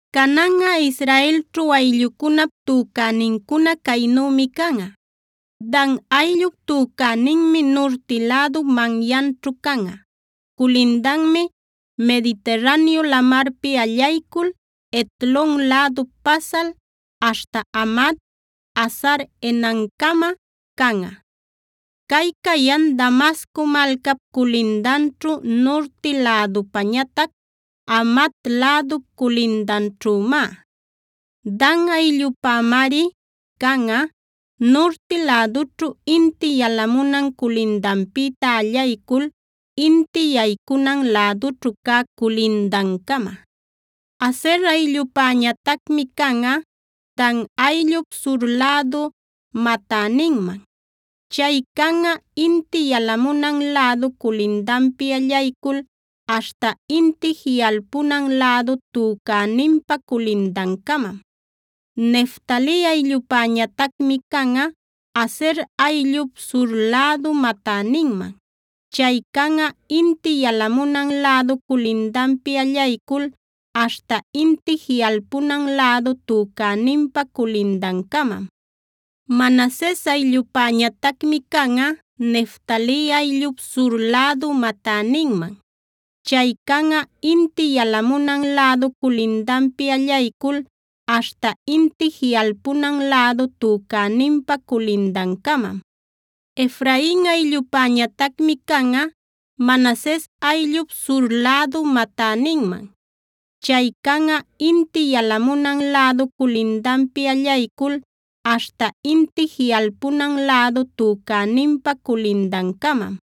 “Cananꞌa Israelćhu ayllucunap tücänincuna caynümi canꞌa: “Dan ayllup tücäninmi nurti lädu manyaćhu canꞌa. Culindanmi Mediterraneo Lamarpi allaycul Hetlon lädup pasal, aśhta Hamat, Hazar-enancama canꞌa. Cay cayan Damasco malcap culindanćhu, nurti lädupañatac Hamat lädup culindanćhümá. Dan ayllupämari canꞌa, nurti lädućhu inti yalamunan culindanpïta allaycul inti yaycunan lädućhu cä culindancama. “Aser ayllupäñatacmi canꞌa, Dan ayllup sur lädu matäninman. Chay canꞌa inti yalamunan lädu culindanpi allaycul aśhta inti jiꞌalpunan lädu tücäninpa culindancamam. “Neftali ayllupäñatacmi canꞌa, Aser ayllup sur lädu matäninman. Chay canꞌa inti yalamunan lädu culindanpi allaycul aśhta inti jiꞌalpunan lädu tücäninpa culindancamam. “Manases ayllupäñatacmi canꞌa, Neftali ayllup sur lädu matäninman. Chay canꞌa inti yalamunan lädu culindanpi allaycul aśhta inti jiꞌalpunan lädu tücäninpa culindancamam. “Efrain ayllupäñatacmi canꞌa, Manases ayllup sur lädu matäninman. Chay canꞌa inti yalamunan lädu culindanpi allaycul aśhta inti jiꞌalpunan lädu tücäninpa culindancamam.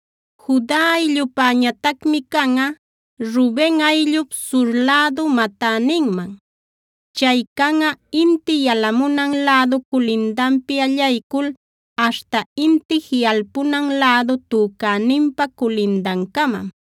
“Juda ayllupäñatacmi canꞌa, Ruben ayllup sur lädu matäninman. Chay canꞌa inti yalamunan lädu culindanpi allaycul aśhta inti jiꞌalpunan lädu tücäninpa culindancamam.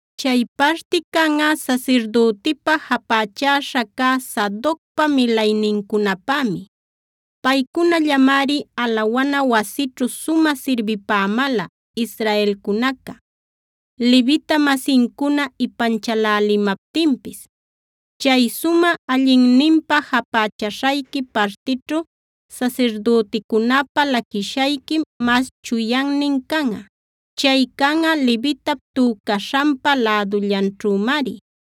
Chay parti canꞌa sasirdütipa japächaśha cä Sadocpa milaynincunapämi. Paycunallamari alawana wasićhu sumä sirbipämäla israelcunaca, Levita-masincuna ipanchalälimaptinpis. Chay sumä allinninpä japächaśhayqui partićhu sasirdüticunäpä laquishayquim mas chuyannin canꞌa. Chay canꞌa levitap tücaśhanpa lädullanćhümari.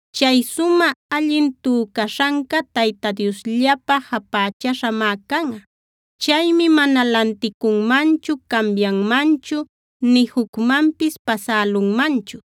Chay sumä allin tücaśhanca Tayta Diosllapä japächäśhamá canꞌa. Chaymi mana lanticunmanchu, cambianmanchu, nï jucmanpis pasälunmanchu.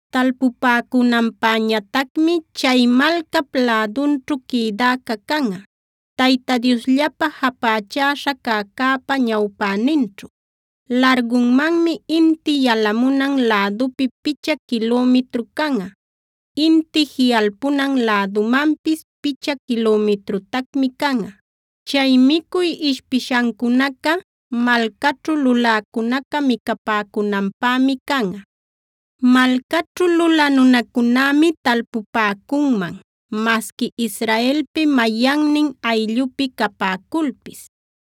Talpupäcunanpäñatacmi chay malcap lädunćhu quïdäca canꞌa, Tayta Diosllapa japächäśha cäcäpa ñawpäninćhu. Largunmanmi inti yalamunan lädupi picha quilümitru canꞌa; inti jiꞌalpunan lädumanpis picha quilümitrutacmi canꞌa. Chay micuy ishpishancunaca malcaćhu luläcunaca micapäcunanpämi canꞌa. Malcaćhu lulä nunacunämi talpupäcunman, masqui Israelpi mayannin ayllupi capäculpis.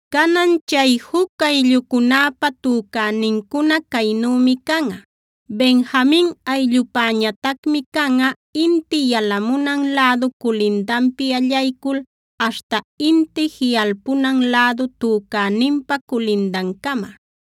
“Canan, chay juc ayllucunäpä tücänincuna caynümi canꞌa: “Benjamin ayllupäñatacmi canꞌa, inti yalamunan lädu culindanpi allaycul aśhta inti jiꞌalpunan lädu tücäninpa culindancama.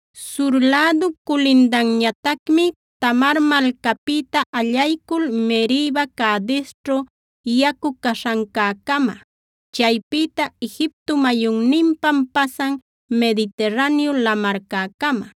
Sur lädup culindanñatacmi Tamar malcapïta allaycul Meriba-Cadesćhu yacu caśhancäcama, chaypïta Egipto mayunninpam pasan Mediterraneo Lamarcäcama.